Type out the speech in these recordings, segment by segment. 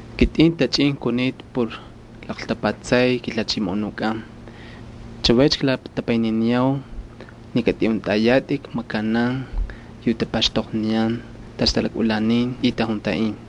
Kitꞌin ktachꞌin kunita por klaqltapatsay kiJalhachimoꞌonukꞌan. Chavaycha klatapayniniyau ni katꞌiꞌuntꞌayatꞌik makanan yu tapaxtoqniyan tacha talakꞌulanin Dios y tajuntaꞌin.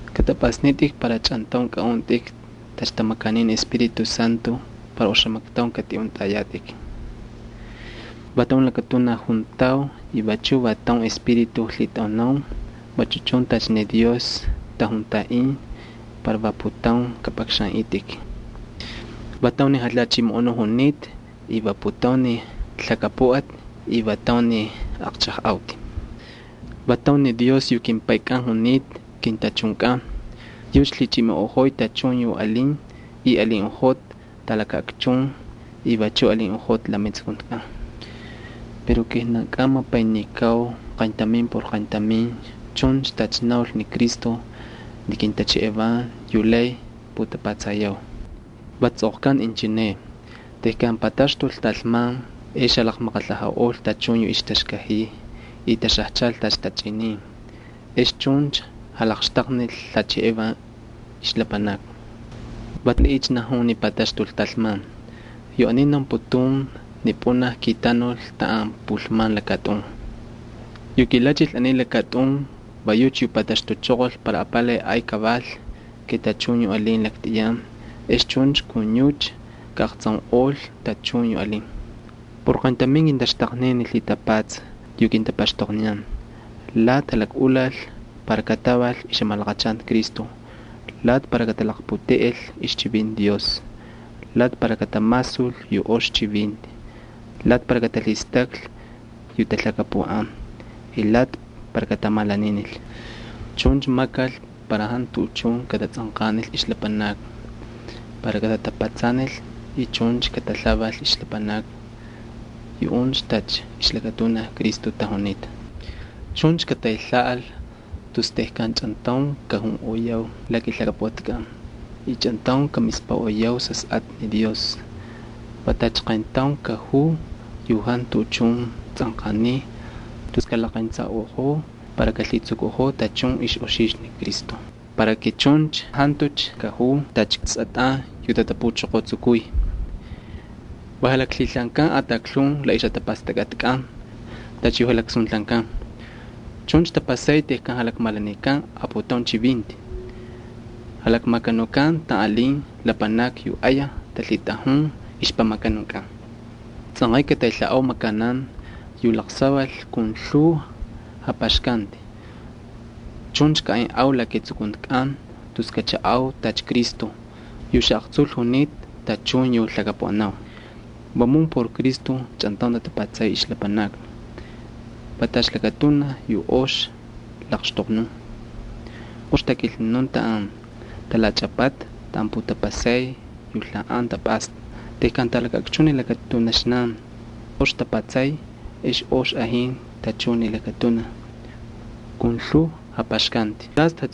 Kꞌatꞌapꞌasnitꞌik para chꞌantaun kꞌaꞌuntꞌik tacha tamakanin ni Espíritu Santo para oxamaktaun katꞌiꞌuntꞌayatꞌik. Va taun lakatunaj juntau y vachu va taun Espíritu lhitꞌaunau, vachu chun tacha ni Dios tajuntaꞌin para va putaun kꞌapꞌakxanꞌitꞌik. Va taun ni Jalhachimoꞌonuꞌ junita y va putaun ni lhakapuꞌati y va taun ni aqchajꞌauti. Va taun ni Dios yu kimPaykꞌan junita kintachunkꞌan. Yucha lhichimoꞌojoy tachun yu alin y alinꞌojota talakaꞌakchun y vachu alinꞌojota la metsukuntikꞌan. Pero kijnankꞌan mapaynikau qayntamin por qayntamin chuncha tacha naulcha ni Cristo ni kintaxtaqnin yu lay putapatsayau. Va tsꞌoqkanta inchineꞌ: Tejkan pataxtul talman ex jalaqmaqalhajaꞌol tachun yu ixtaxkajiy y taxajchal tacha tachꞌinin, ex chuncha jalaqxtaqnil lhacheꞌevan ixlapanakni. ¿Valiꞌiycha najun ni pataxtul talman? Yu aniy naunputun ni pꞌunaj kitanul taꞌan pulman lakatꞌun. Yu kilachil aniy lakatꞌun va yucha yu pataxtuchoqol para apalay ay kaval ke tachun yu alin laktꞌiyan, ex chuncha kun yucha kaꞌaqtsaunꞌol tachun yu alin. Por qayntamin kintaxtaqnin ni lhitapatsa yu kintapaxtoqniyan. Lati jalakꞌulakal para kataval ixjamalaqachanti Cristo, lati para katalaqputeꞌel ixchivinti Dios, lati para katamasul yu ox chivinti, lati para katalhistaklhi yu talhakapuꞌan, y lati para katamalaninil. Chuncha makal para jantu tuꞌuchun katatsꞌanqanil ixlapanakni para katatapatsanil y chuncha katalhaval ixlapanakni. Yuꞌuncha tacha ixlakatunaj Cristo tajunita. Chuncha kataylhaꞌal tus tejkan chꞌantaun kajunꞌoyau la kilhakapuꞌatkꞌan y chꞌantaun kamispaꞌoyau Sasꞌatꞌa Dios. Va tacha qayntaun kajuu yu jantu tuꞌuchun tsꞌanqaniy tus kalaqentsaꞌojou para kalhitsukuꞌojoo tachun ixꞌoxixtu ni Cristo. Ex chuncha jantucha kajuu tacha sꞌatꞌan, yu tatapuchoqotsukuy y jalaklhilhaankan ataklhun la ixjatapastakꞌatkꞌan. Chuncha tapasay tejkan jalakmalanikan aputaun chivinti. Jalakmakanukan taꞌan taꞌalin lapanakni yu ayaj talhitꞌajun ixpamakanunkꞌan. Tsꞌanqay kataylhaꞌau makanan yu laqsaval kun lhuu japaxkanti, chuncha kaꞌaynꞌau la ketsukuntikꞌan tus kachaꞌau tacha Cristo yu xaꞌaqtsul junita tachun yu lhakapuꞌanau. Vamun por Cristo tatapatsay ixlapanakni. Va tacha lakatunaj yu ox laqxtoqnun, ox takilnunun taꞌan talachꞌapata taꞌan putapasay yu lhaꞌan tapꞌasta. Tejkan talakaꞌakchun ni lakatunaxnan ox tapatsay ex ox ajin tachun ni lakatunaj kun lhuu japaxkanti.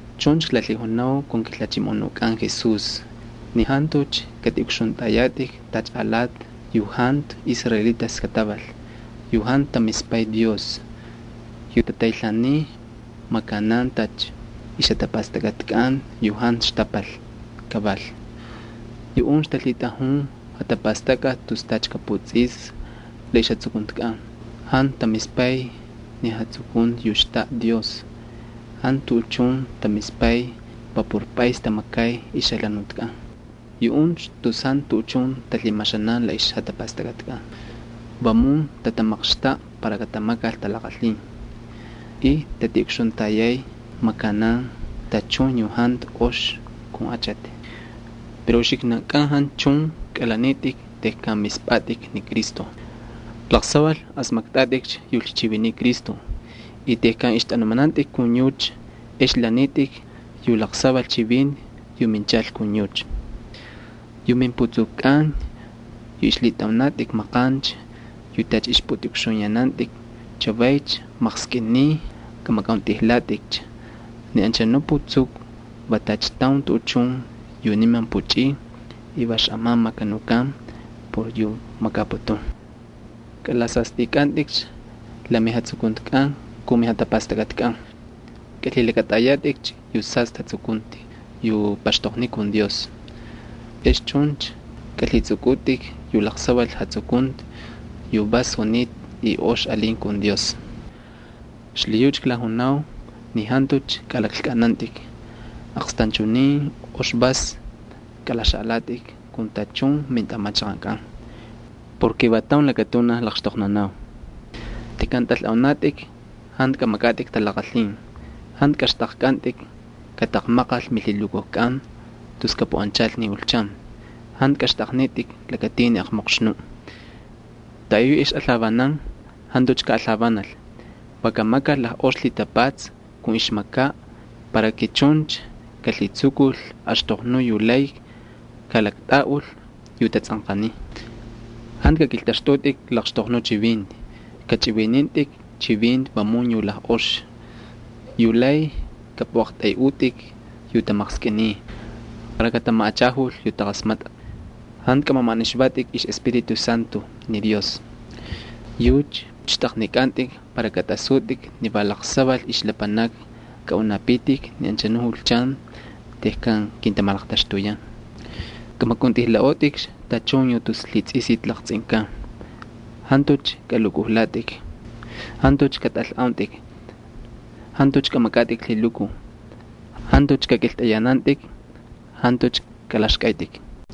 Chuncha klalhijunau kun kiJalhachimoꞌonukꞌan Jesús ni jantucha katꞌiꞌukxuntꞌayatꞌik tacha alati yu jantu israelitas kataval yu jantu tamispay Dios, yu tataylhaaniy makanan tacha ixjatapastakꞌatkꞌan yu jantu xtapal kaval. Yuꞌuncha talhitꞌajun jatapastakꞌati tus tacha kaputsꞌislhi la ixjatsukuntikꞌan, jantu tamispay ni jatsukunti yu xtaꞌa Dios. Jantu tuꞌuchun tamispay va por pꞌays tamakay ixjalhanutkꞌan. Yuꞌuncha tus jantu tuꞌuchun talhimaxanan la ixjatapastakꞌatkꞌan. Vamun tatamaqxtaꞌa para katamakal talaqalhin y tatiꞌukxuntayay makanan tachun yu jantu ox kun achati. Pero uxiknankꞌan jantu chun kꞌalanitꞌik tejkan mispꞌatꞌik ni Cristo. Laqsaval asmaktꞌatꞌikcha yu lhichiviniy Cristo y tejkan ixtꞌanumanantꞌik kun yucha ex lanitꞌik yu laqsaval chivinti yu minchal kun yucha. Yu mimputsukukꞌan yu ixlhitꞌaunatꞌik maqancha yu tacha ixpꞌutꞌiꞌukxuyanantꞌik, chavaycha maqskꞌiniy kamakꞌauntꞌijlatꞌikcha. Ni anchanuꞌ putsuku va tacha taun tuꞌuchun yu niman puchꞌiy y va xꞌaman makanukan por yu makaputun. Kꞌalasastꞌikꞌantꞌikcha la mijatsukuntikꞌan kun mijatapastakꞌatkꞌan. Kalhilakꞌatꞌayatꞌikcha yu sastꞌi jatsukunti yu paxtoqniy kun Dios. Ex chuncha kꞌalhitsꞌukꞌutꞌik yu laqsaval jatsukunti yu vas junita y ox alin kun Dios. Xlhiyucha klajunau ni jantucha kꞌalaklkꞌanantꞌik. Aqstanchunin ox vas kꞌalaxaꞌalatꞌik kun tachun mintꞌamachaqankꞌan porke va taun lakatunaj laqxtoqnunau. Tejkan tꞌalꞌaunatꞌik jantu kꞌamakꞌatꞌik talaqalhin, jantu kꞌaxtꞌaqkꞌantꞌik kataqmaqal milhilukujkꞌan tus kapuꞌanchal ni julchan. Jantu kꞌaxtꞌaqnitꞌik lakatin ni aqmoqxnuꞌ. Taꞌayuꞌ yu ixꞌalhavanan jantucha kaꞌalhavanal, va kamakal lajꞌox lhitapatsa kun ixmakaꞌ para chuncha kalhitsukul axtoqnuꞌ yu lay kalaktꞌaꞌul yu tatsꞌanqaniy. Jantu kakꞌiltꞌaxtꞌutꞌik laqxtoqnuꞌ chivinti. Kachꞌivinintꞌik chivinti vamun yu lajꞌox yu lay kꞌapꞌuꞌaqtꞌayꞌutꞌik yu tamaqskꞌiniy para katamaꞌachajul yu taqasmatꞌa. Jantu kamamaꞌanixvatꞌik ixꞌEspíritu Santo ni Dios. Yucha xtꞌaqnikꞌantꞌik para katꞌasutꞌik ni va laqsaval ixlapanakni kꞌaꞌunapitik ni anchanu julchan tejkan kintamalaqtaxtuyan. Kꞌamakꞌauntꞌijlaꞌotꞌikcha tachun yu tus lhitsꞌisiti laqtsꞌinkan, jantucha kꞌalukꞌujlatꞌik, jantucha katꞌalꞌauntꞌik, jantucha kꞌamakꞌatꞌik lhilukuj, jantucha kakꞌiltꞌayanantꞌik, jantucha kꞌalaxkꞌaytꞌik.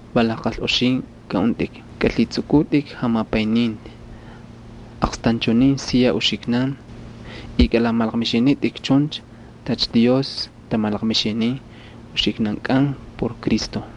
Va lajqalꞌoxin kꞌaꞌuntꞌik, kꞌalhitsꞌukꞌutꞌik jamapayninti aqstanchunin siya uxiknan y kꞌalamalaqmixinitꞌik chuncha tacha Dios tamalaqmixinin uxiknankꞌan por Cristo.